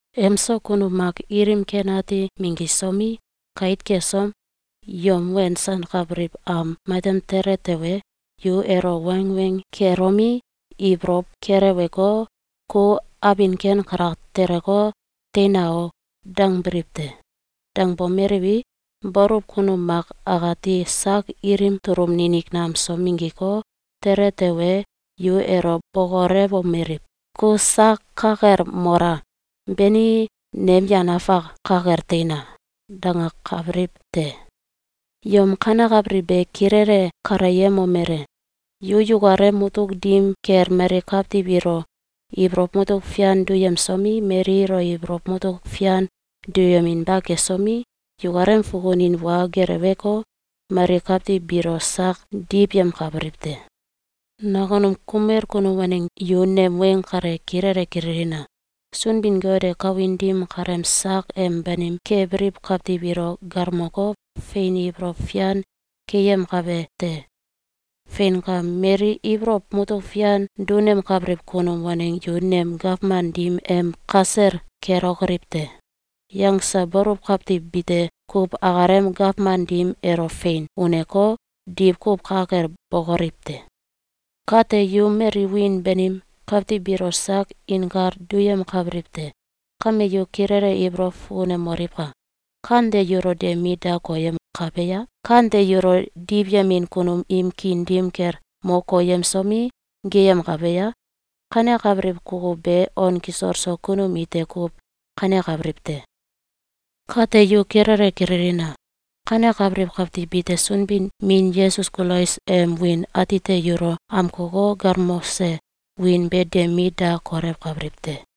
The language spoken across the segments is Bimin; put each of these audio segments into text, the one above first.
Emso kunum mak ilim ken ati minggisomi, kait kesom, yom wensankabiliw am matem tele tewe, yu elo wangweng kelomi, ibolow keleweko, “Ku abin ken kalak teleko, teina o!”, dangbiliw te. Dangbomeliwi, baluw kunum mak akati sak ilim tulum ninik nam so minggiko, tele tewe, yu elo bokolewomeliw: “Ku sak ka kel mola! Beni, nem yan afak ka kel teina!”, dangakabiliw te. Yom kanekabiliw be kilele kaleyemomele: Yu yukalem mutuk dim kel mali kawtiw ilo ibolow mutuk fian duyemsomi, mali ilo ibolow mutuk fian duyeminba kesomi, yukalem fukunin wa geleweko, mali kawtiw biilo sak diwyemkabiliw te. Nakunum kumel kunum waneng yu nem weng kale kilele kililina! Sunbin-Got e kawin dim kaleem sak em banim kebiliw kawtiw ilo galmoko, fein ibolow fian keyemkabe te. Feinka! Mali “Ibolow mutuk fian dunemkabiliw kunum waneng yu nem gawman dim em kasel kelokoliw te!”, yangse baluw kawtiw bite kuw akalem gawman dim elo fein uneko, diwkuw ka kel bokoliw te. Kate, yu mali wiin banim kawtiw biilo sak inkal duyemkabiliw te. Kame yu kilele ibolow fukunemoliwka! Kante yulo de mit da koyemkabe a? Kante yulo diwyemin kunum im kiin dim kel mo koyemsomi, geyemkabe a? Kanekabiliw kukuw be on kisol so kunum ite kuw kanekabiliw te. Kate yu kilele kililina! Kanekabiliw kawtiw bite Sunbin-Min Yesus Kulais em wiin atite yulo amkoko, galmose wiin be de mit da kolewkabiliw te.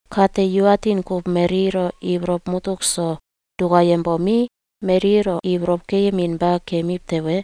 Kate, yu atin kuw mali ilo ibolow mutuk so dukayembomi, mali ilo ibolow keyeminba kemiw tewe,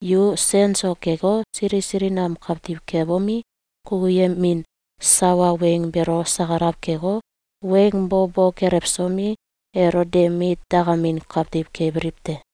yu sen so keko, sili sili nam kawtiw kebomi, kukuyemin sawa weng beelo sakalaw keko, weng bo bo kelewsomi, elo de mit dakamin kawtiw kebiliw te.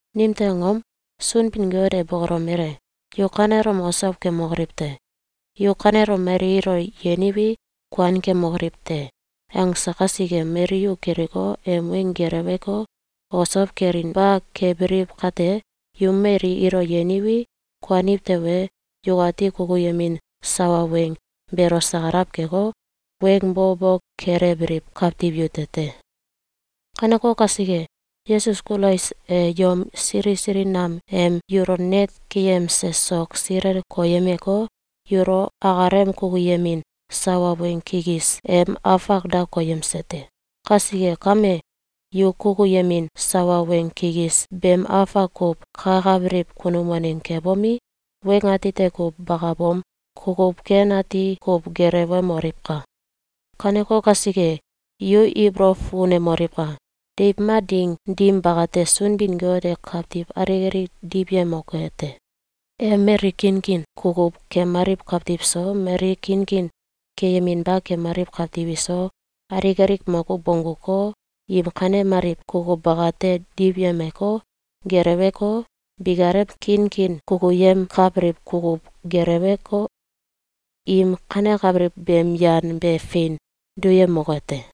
Nimtew angom? Sunbin-Got e bokolomele: “Yu kanelom osow kemokoliw te!” “Yu kanelom mali ilo yeniwi, kuan kemokoliw te!”, angse kasike, mali yu kiliko, em weng geleweko, osow kelinba kebiliw kate, yu mali ilo yeniwi, kuaniw tewe, yukati kukuyemin sawa weng beelo sakalaw keko, weng bo bo kelewbiliw kawtiw yute te. Kaneko kasike, Yesus Kulais e yom sili sili nam em yulo net keyemse sok silel koyemeko, yulo akalem kukuyemin sawa weng kikis em afak da koyemse te. Kasike kame, yu kukuyemin sawa weng kikis beem afak kuw kakabiliw kunum waneng kebomi, weng atite kuw bakabom, kukuw ken ati kuw gelewemoliwka! Kaneko kasike, yu ibolow fukunemoliwka! Deiw mak ding dim bakate, Sunbin-Got e kawtiw alik alik diwyemoke te. E mali kinkin kukuw kemaliw kawtiw so, mali kinkin keyeminba kemaliw kawtiw iso, alik alik makuw bongguko, im kanemaliw kukuw bakate diwyemeko, geleweko, bikalem kinkin kukuyemkabiliw kukuw gelewko, im kanekabiliw beem yan be fein duyemoke te.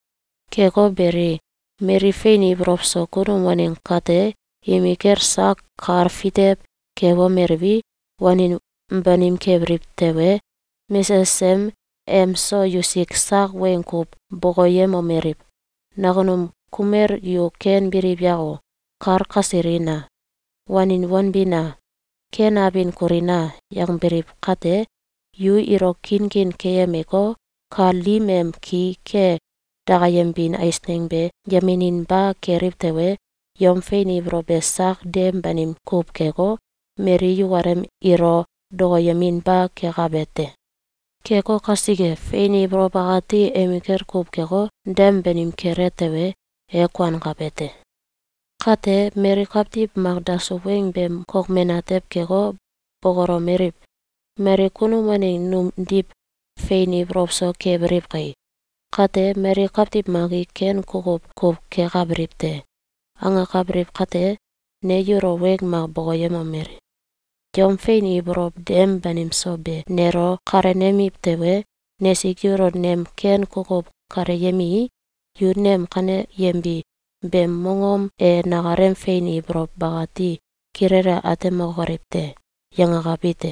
Keko beli, mali fein ibolow so kunum waneng kate, imikel sak kal fitew kebomeliwi, wanin banim kebiliw tewe, mesesem emso yusik sak weng kuw bokoyemomeliw: “Nakunum kumel yu ken biliw yako! Kal kasilina! Wanin wanbina! Ken abin kulina!”, yangbiliw kate, yu ilo kinkin keyemeko, kal dim em ki ke dakayembin eisneng be yemeninba keliw tewe, yom fein ibolow be sak dem banim kuw keko, mali yukalem ilo dokoyeminba kekabe te. Keko kasike, fein ibolow akati emikel kuw keko, dem banim kele tewe, e kuankabe te. Kate, mali kawtiw mak dasuw weng beem kokmen atew keko, bokolomeliw: “Mali kunum waneng numdiw fein ibolow so kebiliw kai! Kate, mali kawtiw mak i ken kukuw kuw kekabiliw te!”, angakabiliw kate, ne yulo weng mak bokoyemomeli: “Yom fein ibolow dem banim so be nelo kalenemiw tewe, nesik yulo nem ken kukuw kaleyemii, yu nem kaneyembi beem mongom e nakalem fein ibolow bakati kilele atemokoliw te.”, yangakabi te.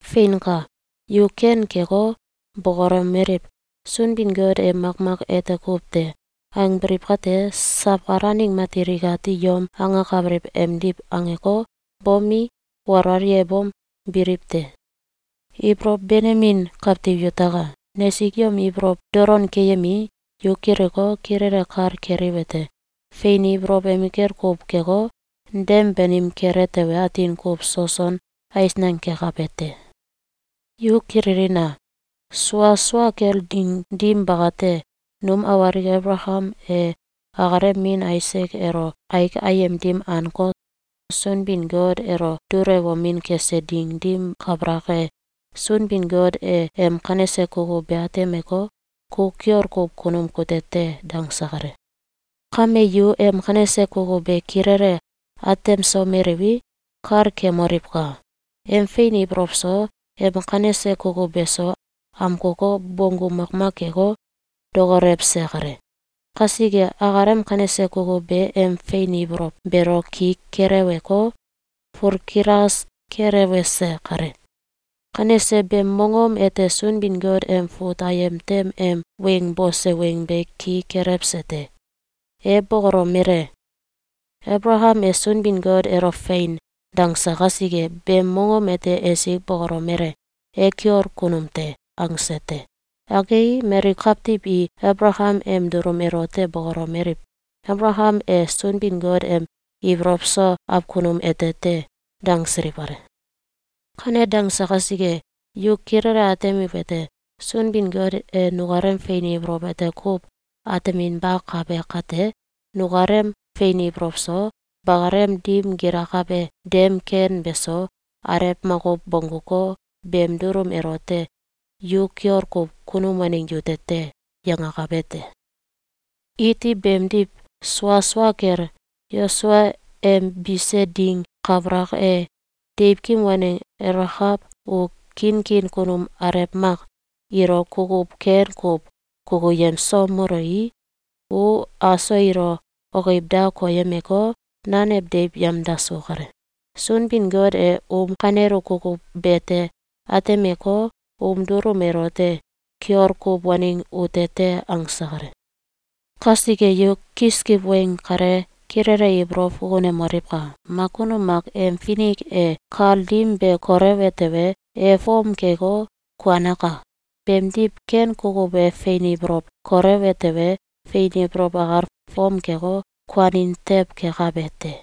Feinka! Yu ken keko, bokolomeliw: “Sunbin-Got e makmak ete kuw te!”, angbiliw kate, sawkal aneng matil ikati yom angakabiliw emdiw angeko, bomi, walwal yebom, biliw te. Ibolow benemin kawtiw yutaka! Nesik yom ibolow dolon keyemii, yu kiliko, kilele kal keliwete: Fein ibolow emikel kuw keko, dem banim kele tewe, atin kuw soson eisneng kekabe te. Yu kililina! Sua sua kel ding dim bakate, num awalik Abalakam e akalem min Aisak elo aik ayem dim anko, Sunbin-Got elo dulewomin kese ding dim kabalak e, Sunbin-Got e em kanese kukuw be atemeko, “Ku kiol kuw kunum kute te!”, dangse kale. Kame yu em kanese kukuw be kilele atemsomeliwi, kal kemoliwka! Em fein ibolow so, em kanese kukuw beso, amkoko, bonggu makmak keko, dokolewse kale. Kasike, akalem kanese kukuw be em fein ibolow beelo ki keleweko, fulkilas kelewese kale. Kanese beem mongom ete Sunbin-Got em fut ayem tem em weng bose weng be ki kelewese te. E bokolomele: “Abalakam e Sunbin-Got elo ‘Fein!’, dangse kasike, beem mongom ete esik bokolomele: ‘E kiol kunum te!’, angse te.”, angei, mali kawtiw i Abalakam em dulum elote bokolomeliw: “Abalakam e Sunbin-Got em ibolow so awkunum ete te!”, dangsiliw kale. Kane dangse kasike, yu kilele atemiwete: Sunbin-Got e nukalem fein ibolow ete kuw ateminbakabe kate, nukalem fein ibolow so, bakalem dim gilakabe dem ken beso, alew makuw bongguko, beem dulum elote “Yu kiol kuw kunum waneng yute te!”, yangakabe te. Iti beemdiw sua sua kel, Yosua em bise ding kabalak e, deiwkim waneng Elakaw u kiinkiin kunum alew mak ilo kukuw ken kuw kukuyemsomelui, u aso ilo okiwda koyemeko, nanew deiw yemdasu kale. Sunbin-Got e um kanelu kukuw bete atemeko, um dulum elote “Kiol kuw waneng ute te!”, angse kale. Kasike yu kiskiw weng kale kilele ibolow fukunemoliwka! Mak kunum mak em finik e kal dim be kolewe tewe, e fom keko, kuanaka. Beemdiw, ken kukuw e fein ibolow kolewe tewe, fein ibolow akal fom keko, kuanin tew kekabe te.